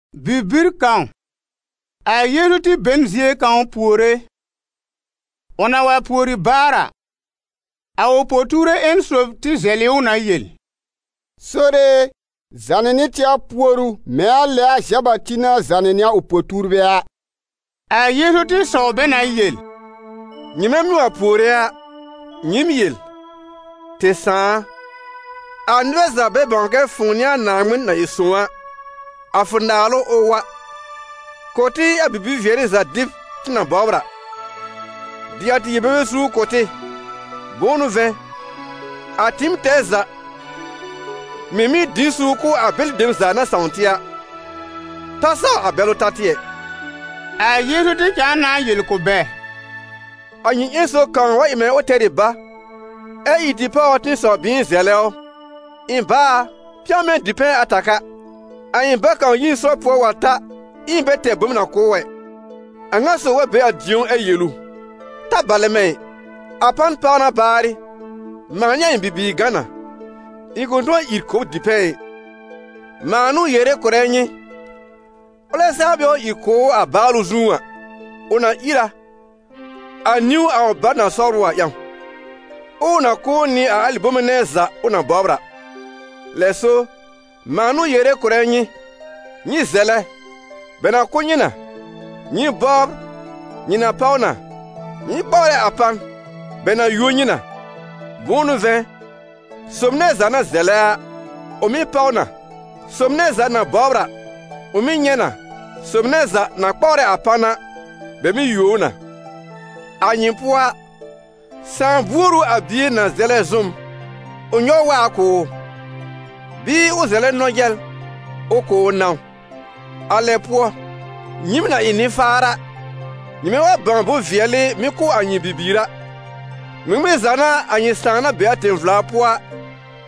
Bibir kãw, a Yeezu tɩ be n zie kãw puore. Ʋ na wa pùori baar a, a ʋ po-tuurbɛ ƴẽn sob tɩ zɛlɩ ʋ na yel: «Sore e, zànɩ nɩ tɩ a puoru mɛ̃ a lɛ a Zã-Bati na zãnɩ nɩ a ʋ po-tuurbɛ a.» A Yeezu tɩ sɔw bɛ na yel: «Nyɩmɛ mɩ́ wa puore a, nyɩɩm yel: ‹Tɩ Sãà a, a nɩbɛ za bɛ bãw kɛ fʋ̃ʋ n'ɩ a Naaŋmɩn na ɩ sõw a, a fʋ naalʋ, ʋ wa. Kʋ̀ tɩ a bibi-vɩɛrɩ za dɩb tɩ na bɔbr a. Dɩ a tɩ yel-bebe suur kʋ̀ tɩ. Bʋ̃ʋ n'ʋ vɛ̃, a tɩɩm tɛɛ za mɩ̀ mɩ́ dɩ n suur kʋ̀ a bɛlɩ dem za na sãw tɩ a. Ta saw a bɛlʋ ta tɩ ɛ.›» A Yeezu tɩ cãa na yel kʋ̀ bɛ: «A nyɩ ƴẽn sob kãw wa ɩ mɛ̃ ʋ tɛr ɩ bá, ɛ ìr tɩ páw ʋ tɩ̃ɩsɔw-bɩ̃ɩn zɛlɛ ʋ: ‹Ɩ̃ bá a, pɛ̃w mɛ̃ dipɛ̃ ata ka, a ɩ̃ bá kãw yi n sɔr pʋɔ wa ta, ɛ ɩ̃ bɛ tɛr bom na kʋ̀ ʋ ɛ.› A ŋa sob wa be a dĩ̀ó ɛ yel ʋ: ‹Ta balɛ mɛ̃ ɩ! A pan pàw na baarɩ, mãa nɩ a ɩ̃ bibiir gã na, ɩ̃ kʋ̃ tʋ̃ɔ ìr kʋ̀ b dipɛ̃ ɩ.› Mãa n'ʋ yere kʋ̀rɛ nyɩ: ʋlɛ saa bɛ wa ìr kʋ̀ ʋ a báalʋ zũú a, ʋ na ìr a, a niwn a ʋ bá na sɔbr ʋ a ƴãw, ɛ ʋ na kʋ̀ ʋ nɩ a alɩ bome nɛ za ʋ na bɔbr a. Lɛ so, mãa n'ʋ yere kʋ̀rɛ nyɩ: nyɩ zɛlɛ, bɛ na kʋ̀ nyɩ na; nyɩ bɔbr, nyɩ na páw na; nyɩ kpawrɛ a pan, bɛ na yuo nyɩ na. Bʋ̃ʋ n'ʋ vɛ̃, sob nɛ za na zɛlɛ a, ʋ mɩ́ páw na, sob nɛ za na bɔbr a, ʋ mɩ́ nyɛ̃ na, sob nɛ za na kpawrɛ a pan a, bɛ mɩ́ yuo ʋ na. A nyɩ pʋɔ a, sãà buor ʋ a bie na zɛlɛ zʋ́m, ʋ nyɔw waab kʋ̀ ʋ? Bɩɩ ʋ na zɛlɛ nɔ-jɛl, ʋ kʋ̀ ʋ nãw? A lɛ pʋɔ, nyɩɩm na ɩ nɩ-faar a, nyɩmɛ wa bãw bʋ̃-vɩɛlɩ mɩ́ kʋ̀ a nyɩ bibiir a, ŋmɩŋmɩn za n'a a nyɩ Sãà na be a tẽ-vla pʋɔ a,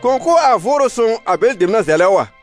kʋ̃ kʋ̀ a Vʋʋrʋ Sõw a bɛlɩ dem na zɛlɛ ʋ a?»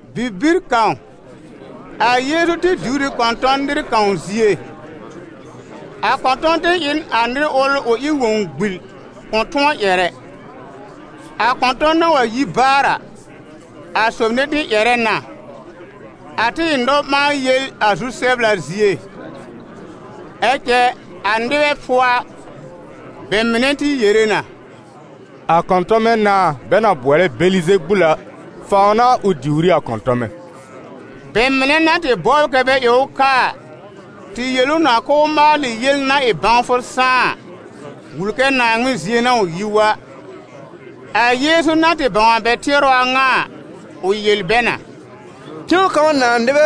Bibir kãw, a Yeezu tɩ diwr ɩ kɔ̃tɔn nɩr kãw zie. A kɔ̃tɔn tɩ ɩ n a nɩr ʋl ʋ ɩ wõw-gbil, kʋ̃ tʋ̃ɔ ƴɛr ɛ. A kɔ̃tɔn na wa yi baar a, a sob nɛ tɩ ƴɛrɛ na, a tɩ ɩ nɔ-ɓãa-yel a zu-sɛbla zie. Ɛ cɛ a nɩbɛ pʋɔ a, bɛ mɩnɛ tɩ yere na: «A kɔ̃tɔmɛ nãà, bɛ na bʋɔlɛ Bɛlɩzebul a, fãw n'a ʋ diwr ɩ a kɔ̃tɔmɛ!» Bɛ mɩnɛ na tɩ bɔbr kɛ bɛ ɩ ʋ kaa a, tɩ yel ʋ na k'ʋʋ maalɩ yel na ɩ bãwfʋ sãá a, wul kɛ Naaŋmɩn zie n'a ʋ yi wa. A Yeezu na tɩ bãw a bɛ tɩɛrʋ a ŋa a, ʋ yel bɛ na: «Tẽw kãw nãà nɩbɛ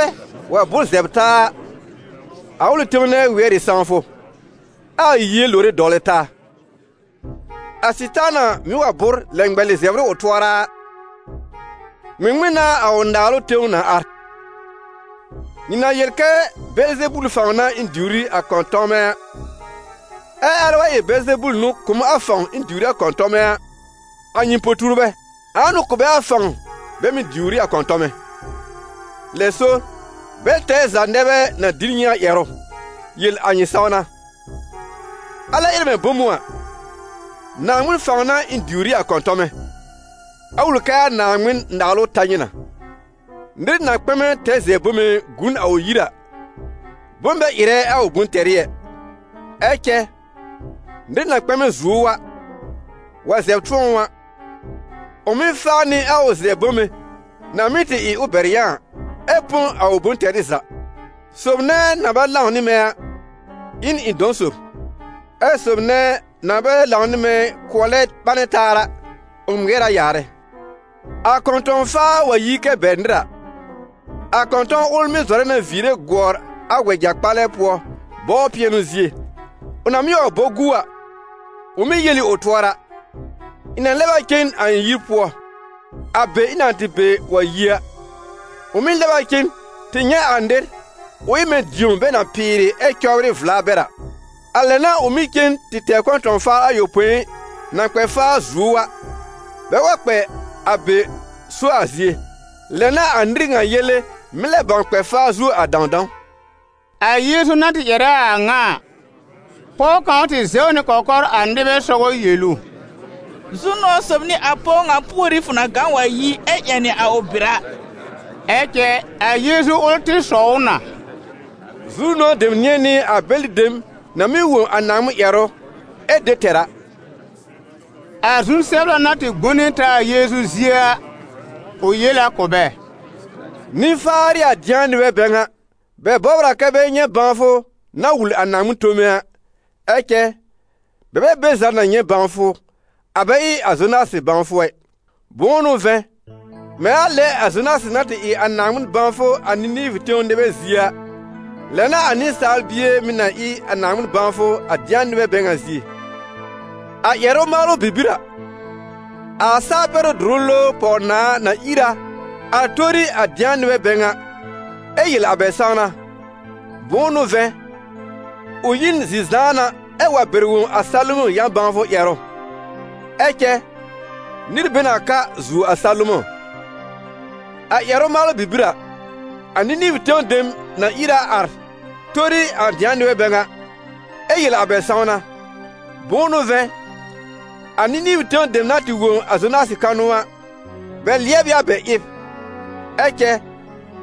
wa bʋ́r zɛbr taa a, a ʋlɩ tẽw nɛ wɩɛr ɩ sãwfʋ, ɛ a yie lore dɔwlɛ taa. A Sɩtaana mɩ̀ wa bʋ́r lɛ ŋmɛlɩ zɛbr ɩ ʋ tʋɔra a, ŋmɩŋmɩn n'a a ʋ naalʋ tẽw na ar? Nyɩ na yel kɛ Bɛlɩzebul fãw n'a ɩ̃ diwr ɩ a kɔ̃tɔmɛ a. Ɛ alɛ wa ɩ Bɛlɩzebul n'ʋ kʋ̀ m a fãw ɩ̃ diwr ɩ a kɔ̃tɔmɛ a, a nyɩ po-tuurbɛ, ãa n'ʋ kʋ̀ bɛ a fãw bɛ mɩ̀ diwr ɩ a kɔ̃tɔmɛ? Lɛ so, bɛl tɛɛ za nɛ bɛ na dɩ n nyɩ a ƴɛrʋ yel a nyɩ sãwna. Alɛ ɩrɛ mɛ̃ bom ʋ a, Naaŋmɩn fãw n'a ɩ̃ diwr ɩ a kɔ̃tɔmɛ, a wul kɛ a Naaŋmɩn-Naalʋ ta nyɩ na. Nɩr na kpɛmɛ tɛr zɛbr bome gu n a ʋ yir a, bom bɛ ɩrɛ a ʋ bʋ̃-tɛrɩ ɛ. Ɛ cɛ nɩr na kpɛmɛ zuo ʋ a, wa zɛb tʋ̃ɔ ʋ a, ʋ mɩ́ faa nɩ a ʋ zɛbr bome na mɩ́ tɩ ɩ ʋ bɛr yã a, ɛ põ a ʋ bʋ̃-tɛrɩ za. Sob nɛ na bɛ lãw nɩ mɛ̃ a, ɩ n ɩ̃ dɔ̃ sob; ɛ sob nɛ na bɛ lãw nɩ mɛ̃ kʋɔlɛ ɓanɛ taa a, ʋ ŋmɩɛr a yaarɛ.» «A kɔ̃tɔ̃-faa wa yi kɛ bɛr nɩr a, a kɔ̃tɔn ʋl mɩ́ zɔrɛ na viire gʋɔr a wɛja-kpalɛ pʋɔ bɔbr pɩɛnʋ zie. Ʋ na mɩ́ wa bɔ gu a, ʋ mɩ́ yel ɩ ʋ tʋɔra: ‹Ɩ̃ na lɛb a cen a ɩ̃ yir pʋɔ, a be ɩ̃ na tɩ be wa yi a.› Ʋ mɩ́ lɛb a cen tɩ nyɛ̃ a nɩr, ʋ ɩ mɛ̃ dĩo bɛ na pɩɩrɩ ɛ cɔbrɩ vla bɛr a. A lɛ n'a ʋ mɩ́ cen tɩ tɛr kɔ̃tɔ̃-faar ayopõi, na kpɛ faa zuo ʋ a, bɛ wa kpɛ a be so a zie. Lɛ n'a a nɩr ŋa yele mɩ́ lɛb bãw kpɛ faa zuo a dãwdãw.» A Yeezu na tɩ ƴɛrɛ a a ŋa a, pɔw kãw tɩ zɛw nɩ kɔkɔr a nɩbɛ sɔgɔ yel ʋ: «Zu-nʋ̃ɔ̀ sob n'ɩ a pɔw ŋa púorí fʋ na gã wa yi, ɛ ƴɛnɩ a bɩ̀r a!» Ɛ cɛ a Yeezu ʋl tɩ sɔw ʋ na: «Zu-nʋ̃ɔ̀ dem nɩ̃ɛ n'ɩ a bɛlɩ dem na mɩ́ wõ a Naaŋmɩn ƴɛrʋ, ɛ de tɛr a!» A zu-sɛbla na tɩ gbone taa a Yeezu zie a, ʋ yel a kʋ̀ bɛ: «Nɩ-faar n'ɩ a dɩ̃a nɩbɛ bɛ ŋa! Bɛ bɔbr a kɛ bɛ nyɛ̃ bãwfʋ na wul a Naaŋmɩn tome a, ɛ cɛ bɛ bɛ be za na nyɛ̃ bãwfʋ, a bɛ ɩ a Zonasɩ bãwfʋ ɛ. Bʋ̃ʋ n'ʋ vɛ̃, mɛ̃ a lɛ a Zonasɩ na tɩ ɩ a Naaŋmɩn bãwfʋ a Nɩnɩvʋ tẽw nɩbɛ zie a, lɛ n'a a Nɩsaal Bie mɩ̀ na ɩ a Naaŋmɩn bãwfʋ a dɩ̃a nɩbɛ bɛ ŋa zie. A ƴɛrʋ-maalʋ bibir a, a Saa-pɛrɩ́-dʋrʋ-lowr pɔw-nãà na ìr a ar tori a dɩ̃a nɩbɛ bɛ ŋa, ɛ yel a bɛ sãwna. Bʋ̃ʋ n'ʋ vɛ̃, ʋ yi n zi-zãana ɛ wa bɛr wõ a Salomɔ̃ yã-bãwfʋ ƴɛrʋ. Ɛ cɛ nɩr be n a ka zuo a Salomɔ̃. A ƴɛrʋ-maalʋ bibir a, a Nɩnɩvʋ tẽw dem na ìr a ar tori a dɩ̃a nɩbɛ bɛ ŋa, ɛ yel a bɛ sãwna. Bʋ̃ʋ n'ʋ vɛ̃, a Nɩnɩvʋ tẽw dem na tɩ wõ a Zonasɩ kanʋ a, bɛ lɩɛb ɩ a bɛ ɩb. Ɛ cɛ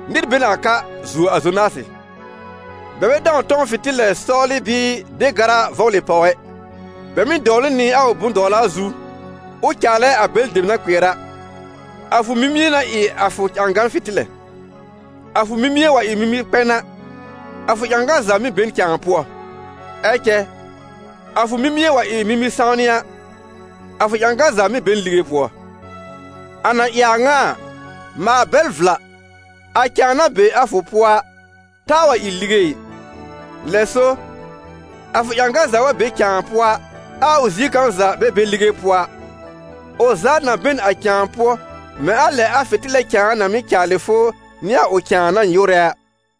nɩr be n a ka zuo a Zonasɩ.» «Bɛ bɛ dãw tɔ̃w fɩ̃tɩlɛ sɔwlɩ bɩɩ de gara vɔblɩ pàw ɛ. Bɛ mɩ́ dɔwlɩ ʋ nɩ a ʋ bʋ̃-dɔwla zu, ʋ caalɛ a bɛlɩ dem na kpɩɛr a. A fʋ mimie n'a ɩ a fʋ ƴãgan fɩ̃tɩlɛ: a fʋ mimie wa ɩ mimi-kpɛn a, a fʋ ƴãgan za mɩ́ be n cãa pʋɔ. Ɛ cɛ a fʋ mimie wa ɩ mimi-sãwnɩ a, a fʋ ƴãgan za mɩ́ be n lige pʋɔ. A na ɩ a ŋa a, maal bɛl vla, a cãa na be a fʋ pʋɔ a, taa wa ɩ lige ɩ. Lɛ so a fʋ ƴãgan za wa be a cãa pʋɔ a, ɛ a ʋ zie kãw za bɛ be lige pʋɔ a, ʋ za na be n a cãa pʋɔ mɛ̃ a lɛ a fɩ̃tɩlɛ cãa na mɩ́ caalɩ fʋ nɩ a ʋ cãa na nyɩwrɛ a.»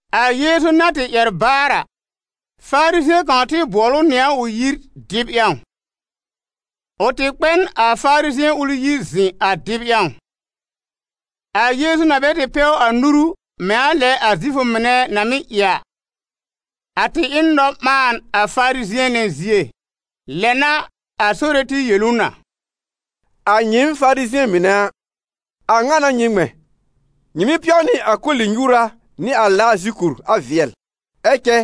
A Yeezu na tɩ ƴɛr baar a, Farizɩ̃ɛ kãw tɩ bʋɔl ʋ nɩ a ʋ yir, dɩb ƴãw. Ʋ tɩ kpɛ n a Farizɩ̃ɛ ʋl yir zɩ̃ a dɩb ƴãw. A Yeezu na bɛ tɩ pɛw a nuru mɛ̃ a lɛ a Zifʋ mɩnɛ na mɩ́ ɩ a, a tɩ ɩ n nɔ-ɓãan a Farizɩ̃ɛ nɛ zie. Lɛ n'a a Sore tɩ yel ʋ na: «A nyɩɩm Farizɩ̃ɛ mɩnɛ a, a ŋa n'a nyɩ ŋmɛ̃: nyɩ mɩ́ pɛw nɩ a koli-nyuura nɩ a laa zikur a vɩɛl, ɛ cɛ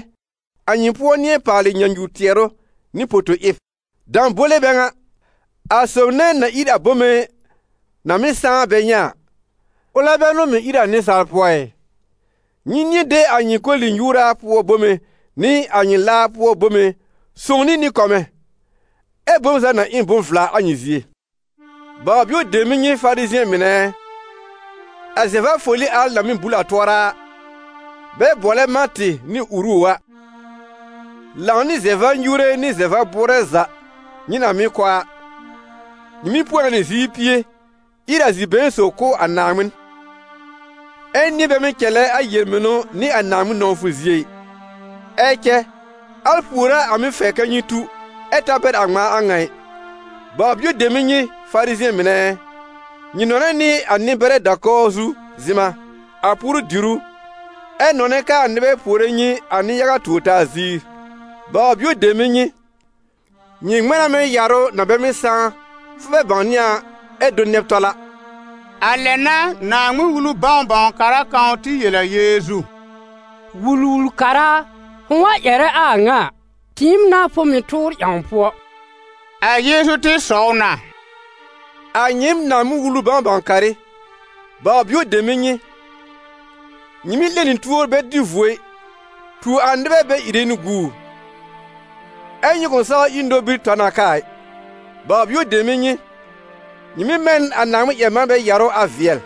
a nyɩ pʋɔ nɩ̃ɛ paalɩ nyãnyu-tɩɛrʋ nɩ poto-ɩb. Dãbole bɛ ŋa! A sob nɛ na ír a bome na mɩ́ sãá bɛ nyɛ̃ a, ʋlɛ bɛ n'ʋ mɩ̀ ír a nɩsaal pʋɔ ɩ? Nyɩ nɩ̃ɛ de a nyɩ koli-nyuura pʋɔ bome nɩ a nyɩ laar pʋɔ bome sõw nɩ nɩ-kɔmɛ̃, ɛ bom za na ɩ n bʋ̃-vla a nyɩ zie. Baw-bio dem n'ɩ nyɩ Farizɩ̃ɛ mɩnɛ ɛ! A zɛ-va-foli al na mɩ́ bul a tʋɔra, bɛ bʋɔlɛ mãtɩ nɩ uru a, lãw nɩ zɛ-va-nyuure nɩ zɛ-va-bʋʋrɛ za nyɩ na mɩ́ kɔ a, nyɩ mɩ́ põ a nɩ ziir pie ír a zi-been sob kʋ̀ a Naaŋmɩn, ɛ nɩ̃ɛ bɛ mɩ́ cɛlɛ a yel-mɩnʋ nɩ a Naaŋmɩn nɔ̃wfʋ zie ɩ. Ɛ cɛ al pùor a a mɩ́ fɛr kɛ nyɩ tu, ɛ ta bɛr a ŋmãa a ŋa ɩ. Baw-bio dem n'ɩ nyɩ Farizɩ̃ɛ mɩnɛ ɛ! Nyɩ nɔnɛ nɩ a nɩ-bɛrɛ da-kɔwr zu zɩ̃ma a puoru-dìrú, ɛ nɔnɛ kɛ a nɩbɛ puore nyɩ a nɩ-yaga tuor-taa ziir. Baw-bio dem n'ɩ nyɩ! Nyɩ ŋmɛ̃ na mɛ̃ yarʋ na bɛ mɩ́ sãá, fʋ bɛ bãwnɩ a ɛ do nɛb tɔl a!» A lɛ n'a Naaŋmɩn-Wulu bãw-bãw-kara kãw tɩ yel a Yeezu: «Wul-wul-kara a, fʋ̃ʋ wa ƴɛrɛ a ŋa a, tɩɩm n'a fʋ mɩ̀ tʋʋr ƴãw pʋɔ!» A Yeezu tɩ sɔw na: «A nyɩɩm Naaŋmɩn-Wulu bãw-bãw-karɩ, baw-bio dem n'ɩ nyɩ: nyɩ mɩ́ 'lẽ nɩ tuor bɛ dɩ vuo ɩ, tuo a nɩbɛ bɛ ìre nɩ guur, ɛ́ nyɩ kʋ̃ saw ír nobir tɔ n a kaa ɩ. Baw-bio dem n'ɩ nyɩ! Nyɩ mɩ́ mɛ n a Naaŋmɩn-ƴɛr-manbɛ yarʋ a vɩɛl,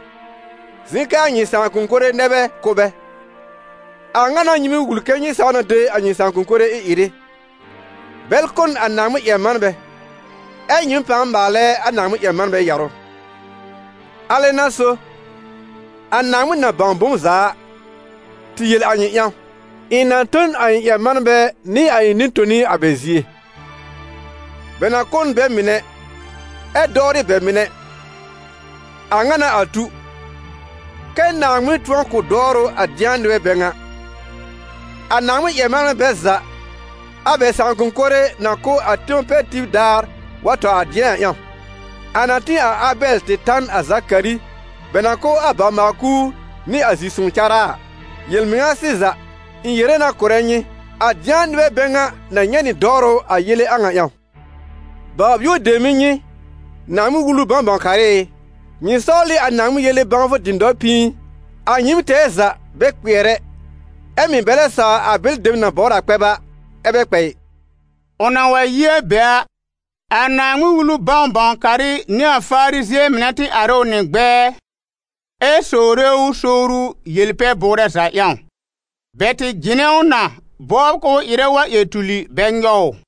zɩ̃ kɛ a nyɩ sãakʋm mɩnɛ nɛ bɛ kʋ́ bɛ. A ŋa n'a nyɩ mɩ́ wul kɛ nyɩ saw na de a nyɩ sãakʋm mɩnɛ ɩ-ɩrɩ. Bɛl kʋ́ n a Naaŋmɩn-ƴɛr-manbɛ, ɛ nyɩɩm pãa maalɛ a Naaŋmɩn-ƴɛr-manbɛ yarʋ. Alɛ n'a so, a Naaŋmɩn na bãw bom za a, tɩ yel a nyɩ ƴãw: ‹Ɩ̃ na tõ n a ɩ̃ ƴɛr-manbɛ nɩ a ɩ̃ nɩ-toni a bɛ zie; bɛ na kʋ́ n bɛ mɩnɛ, ɛ dɔwrɩ bɛ mɩnɛ.› A ŋa n'a a tu, kɛ́ Naaŋmɩn tʋ̃ɔ kʋ̀ dɔwrʋ a dɩ̃a nɩbɛ bɛ ŋa, a Naaŋmɩn-ƴɛr-manbɛ bɛl za a bɛ sãakʋm mɩnɛ na kʋ́ a tẽw pɛr tib daar wa tɔ a dɩ̃a a ƴãw, a na tĩ a Abɛl tɩ ta n a Zakari bɛ na kʋ́ a bawr-maal-kuur nɩ a zi-sõw cárá a. Yel-mɩŋa sɩza, ɩ̃ yere na kʋ̀rɛ nyɩ, a dɩ̃a nɩbɛ bɛ ŋa na nyɛ̃ nɩ dɔwrʋ a yele a ŋa ƴãw. Baw-bio dem n'ɩ nyɩ, Naaŋmɩn-Wulu bãw-bãw-karɩ ɩ! Nyɩ sɔwl ɩ a Naaŋmɩn yele bãwfʋ dɩ̃dɔr pĩi. A nyɩɩm tɛɛ za bɛ kpɩɛr ɛ, ɛ mɩ̀ bɛ lɛ sawr a bɛlɩ dem na bɔbr kpɛb a, ɛ bɛ kpɛ ɩ.» Ʋ na wa yi a be a, a Naaŋmɩn-Wulu bãw-bãw-karɩ nɩ a Farizɩ̃ɛ mɩnɛ tɩ ar ɩ ʋ nɩ ʋ gbɛɛ, ɛ sowre ʋ sowru yel-pɛ-bʋʋrɛ za ƴãw. Bɛ tɩ jɩnɛ ʋ na bɔbr k'ʋʋ ɩrɛ wa ƴɛr tuli bɛ nyɔw ʋ.